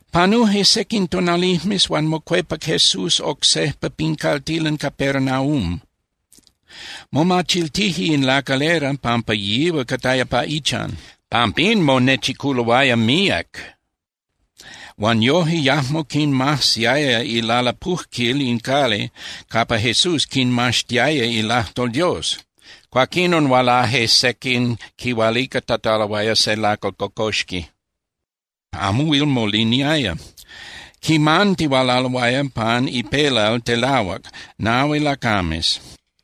Panuje sequin tonalijmes, huan mocuepac Jesús oc sejpa pin caltilan Capernaum. Momachiltije in lacalera pampa yihual cataya pa ichan. Pampín monechiculoaya míac huan yoje yajmo quinmajsiaya ilalapujquil in cali capa Jesús quinmaxtiaya ilajtol Dios. Cuaquinon hualaje sequin quihualicatataloaya se lacal cocoxqui, amo huil moliniaya. Quimantihualaloaya pan ipelal telahuac nahui lacames.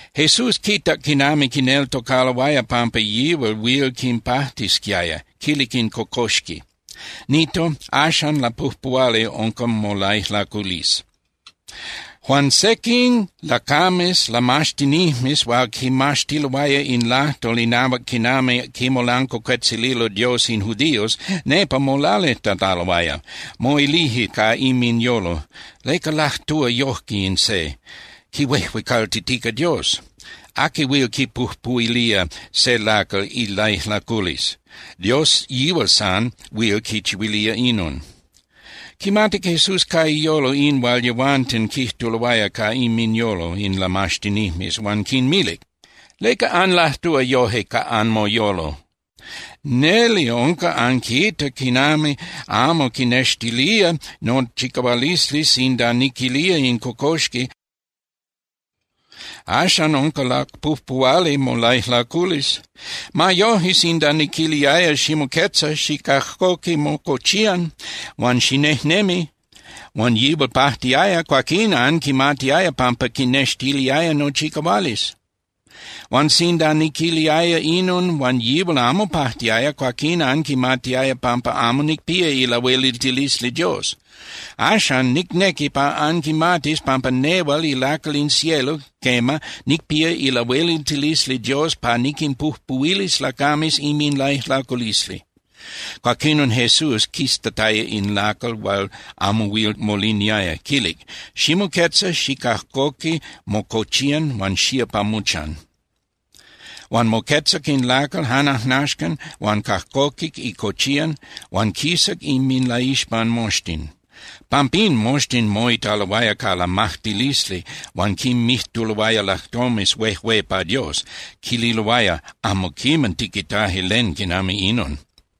Jesús quitac quinami quineltocaloaya pampa yihual huil quipajtisquiaya, quilic in cocoxqui: —Nito, axan lapujpuhuali unca molaijlaculisli. Huan sequin lacames lamaxtinijmes hual quimaxtiloaya in lajtol inahuac quinami quimolancuacuetzililo Dios in judíos nepa molalijtataloaya. Moilije ca inminyolo: “¿Leca lajtúa yojque in se? Quihuejuecaltitica Dios. ¿Aqui huil quipujpuhuilía se lacal ilaijlaculisli? Dios yihual san huil quichihuilía inon.” Quimatic Jesús ca iyolo in hual yehuanten quijtuloaya ca inminyolo in lamaxtinijmes huan quinmilic: —¿Leca anlajtúa yoje ca anmoyolo? Neli unca anquita quinami amo quinextilía nochicahualisli sinda niquilía in cocoxqui: “Axan unca lapujpuhuali molaijlaculisli.” Ma yoje, sinda niquiliaya: “Ximoquetza, xicajcoqui mocochiyan huan xinejnemi”, huan yihual pajtiaya, cuaquín anquimatiaya pampa quinextiliaya nochicahualisli. Huan sinda niquiliaya inon huan yihual amo pajtiaya, cuaquín anquimatiaya pampa amo nicpía ilahueliltilisli Dios. Axan, nicnequi pa anquimatis pampa nehual ilacal in cielo, quema, nicpía ilahueliltilisli Dios pa niquinpujpuhuilis lacames inminlaijlaculisli. Cuaquinon Jesús quiztataya in lacal hual amo huil moliniaya, quilic: —Ximoquetza, xicajcoqui mocochiyan huan xía pa mochan. Huan moquetzac in lacal jan ajnaxcan huan cajcoquic icochiyan huan quisac inminlaixpan moxtin. Pampín moxtin moitaloaya ca lamajtilisli huan quinmijtuloaya lajtomes huejué pa Dios. Quililoaya: —Amo quiman tiquitaje len quinami inon.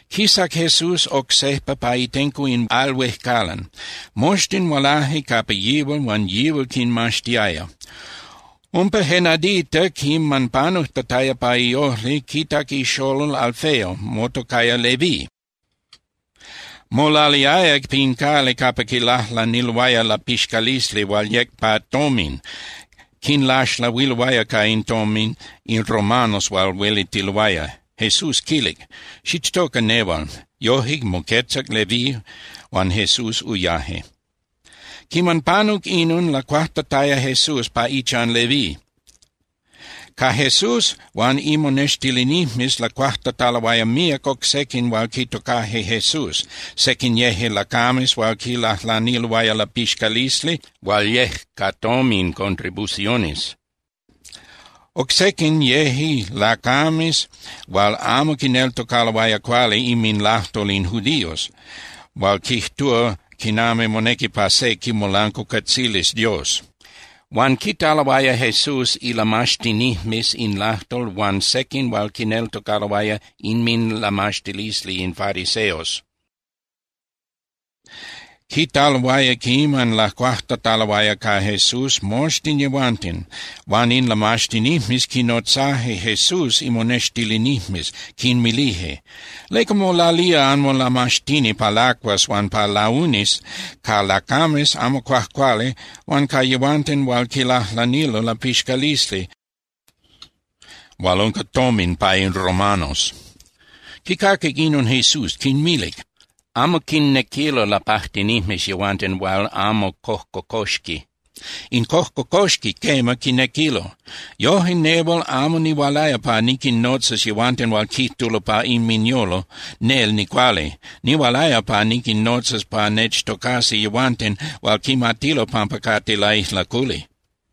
Quisac Jesús oc sejpa pa itenco in al huejcalan. Moxtin hualaje capa yihual huan yihual quinmaxtiaya. Umpa je nadita quiman panujtataya pa iojli, quitac ixolol Alfeo motocaya Leví. Molaliaya pin cali capa quilajlaniloaya lapixcalisli hual yec pa tomin, quinlaxlahuiloaya ca in tomin in romanos hual huelitiloaya. Jesús quilic: —Xichtoca nehual. Yoje, moquetzac Leví, huan Jesús uyaje. Quiman panuc inon lacuajtataya Jesús pa ichan Leví. Ca Jesús huan imonextilinijmes lacuajtataloaya míac oc sequin hual quitocaje Jesús. Sequin yeje lacames hual quilajlaniloaya lapixcalisli hual yec ca tomin (contribuciones). Oc sequin yeje lacames hual amo quineltocaloaya cuali inminlajtol in judíos hual quijtúa quinami monequi pa se quimolancuacuetzilis Dios. Huan quitaloaya Jesús ilamaxtinijmes in lajtol huan sequin hual quineltocaloaya inminlamaxtilisli in fariseos. Quitaloaya quinami lacuajtataloaya ca Jesús moxtin yehuanten. Huan in lamaxtinijmes quinnotzaje Jesús imonextilinijmes, quinmilije: —¿Leca molalía anmolamaxtini pa lacuas huan pa launis ca lacames amo cuajcuali huan ca yehuanten hual quilajlanilo lapixcalisli hual unca tomin pa in romanos? Quicaquic inon, Jesús quinmilic: —Amo quinnequilo lapajtinijmes yehuanten hual amo cojcocoxqui. In cojcocoxqui, quema, quinnequilo. Yojque nehual amo nihualaya pa niquinnotzas yehuanten hual quijtulo pa inminyolo: “Nel nicuali.” Nihualaya pa niquinnotzas pa nechtocasi yehuanten hual quimatilo pampa cate laijlaculi.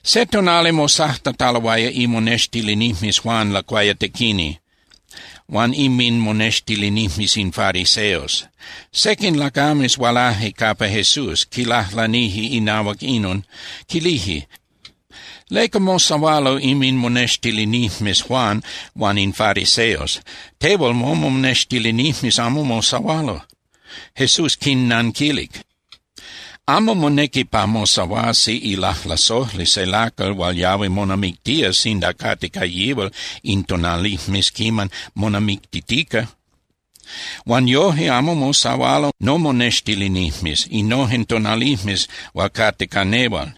Se tonali mosajtataloaya imonextilinijmes Juan Lacuayatequini huan inminmonextilinijmes in fariseos. Sequin lacames hualaje capa Jesús, quilajlanije inahuac inon, quilije: —¿Leca mosahualo inminmonextilinijmes Juan huan in fariseos? Tehual momonextilinijmes amo mosahualo. Jesús quinnanquilic: —Amo monequi pa mosahuasi ilajlasojli se lacal hual yahui monamictía sinda cate ca yihual in tonalijmes quiman monamictitica. Huan yoje amo mosahualo nomonextilinijmes innojen tonalijmes hual cate ca nehual.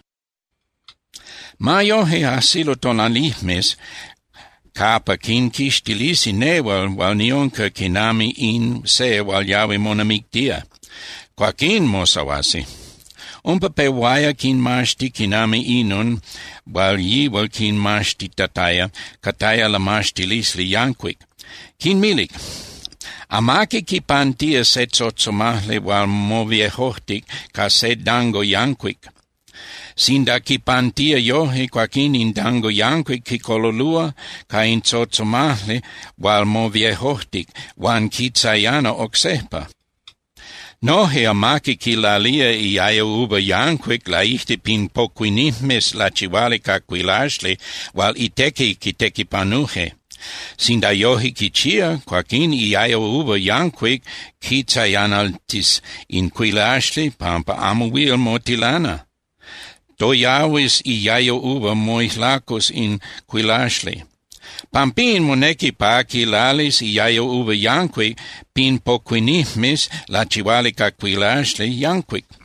Ma yoje, ajsilo tonalijmes capa quinquixtilisi nehual hual niunca quinami in se hual yahui monamictía. Cuaquín mosahuasi. Umpa pehuaya quinmaxti quinami inon hual yihual quinmaxtitataya cataya lamaxtilisli yancuic. Quinmilic: —Amaqui quipantía je tzotzomajli hual moviejojtic ca se dango yancuic. Sinda quipantía yoje, cuaquín in dango yancuic quicololúa ca in tzotzomajli hual moviejojtic huan quitzayana oc sejpa. Noje amaqui quilalía iayo uva yancuic laijtic pin pocuinijmes lachihuali ca cuilaxli hual itequi quitequipanuje. Sinda yoje quichía, cuaquín iayo uva yancuic quitzayanaltis in cuilaxli pampa amo huil motilana. Toyahuis iayo uva, moijlacus in cuilaxli. Pampín monequi pa quilalis iayo uva yancuic pin pocuinijmes lachihuali ca cuilaxli yancuic.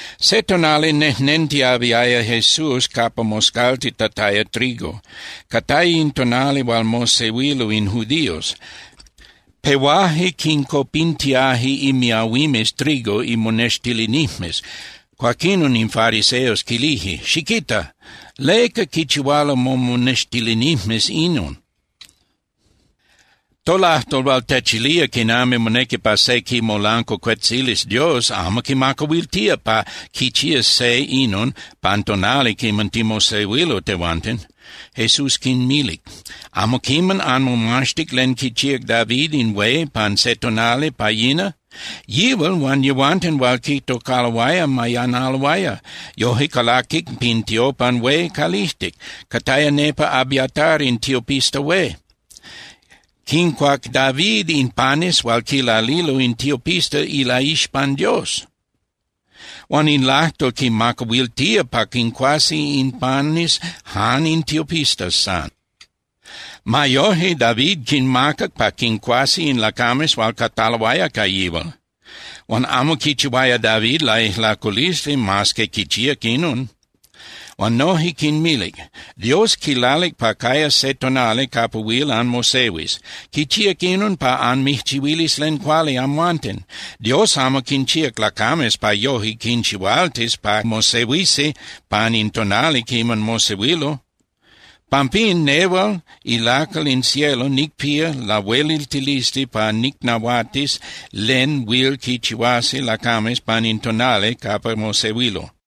Se tonali nejnentiyahuiaya Jesús capa moscaltitataya trigo. Cataya in tonali hual mosehuilo in judíos. Pehuaje quincopintiaje imiahuimes trigo imonextilinijmes. Cuaquinon in fariseos quilije: —Xiquita. ¿Leca quichihualo momonextilinijmes inon? Tolajtol hual techilía quinami monequi pa se quimolancuacuetzilis Dios amo quimacahuiltía pa quichías se inon pan tonali quiman timosehuilo tehuanten. Jesús quinmilic: —¿Amo quiman anmomaxtic len quichíac David in hué pan se tonali pa yina? Yihual huan yehuanten hual quitocaloaya mayanaloaya. Yoje calaquic pin tiopan hué calijtic, cataya nepa Abiatar in tiopista hué. Quincuac David in panes hual quilalilo in tiopistas ilaixpan Dios. Huan in lajtol quimacahuiltía pa quincuasi in panes jan in tiopistas san. Ma yoje, David quinmacac pa quincuasi in lacames hual cataloaya ca yihual. Huan amo quichihuaya David laijlaculisli mas que quichíac inon. Huan noje quinmilic: —Dios quilalic pa cayas se tonali capa huil anmosehuis. Quichíac inon pa anmijchihuilis len cuali amhuanten. Dios amo quinchíac lacames pa yoje quinchihualtis pa mosehuisi pan in tonali quiman mosehuilo. Pampín, nehual ilacal in cielo nicpía lahueliltilisli pa nicnahuatis len huil quichihuasi lacames pan in tonali capa mosehuilo.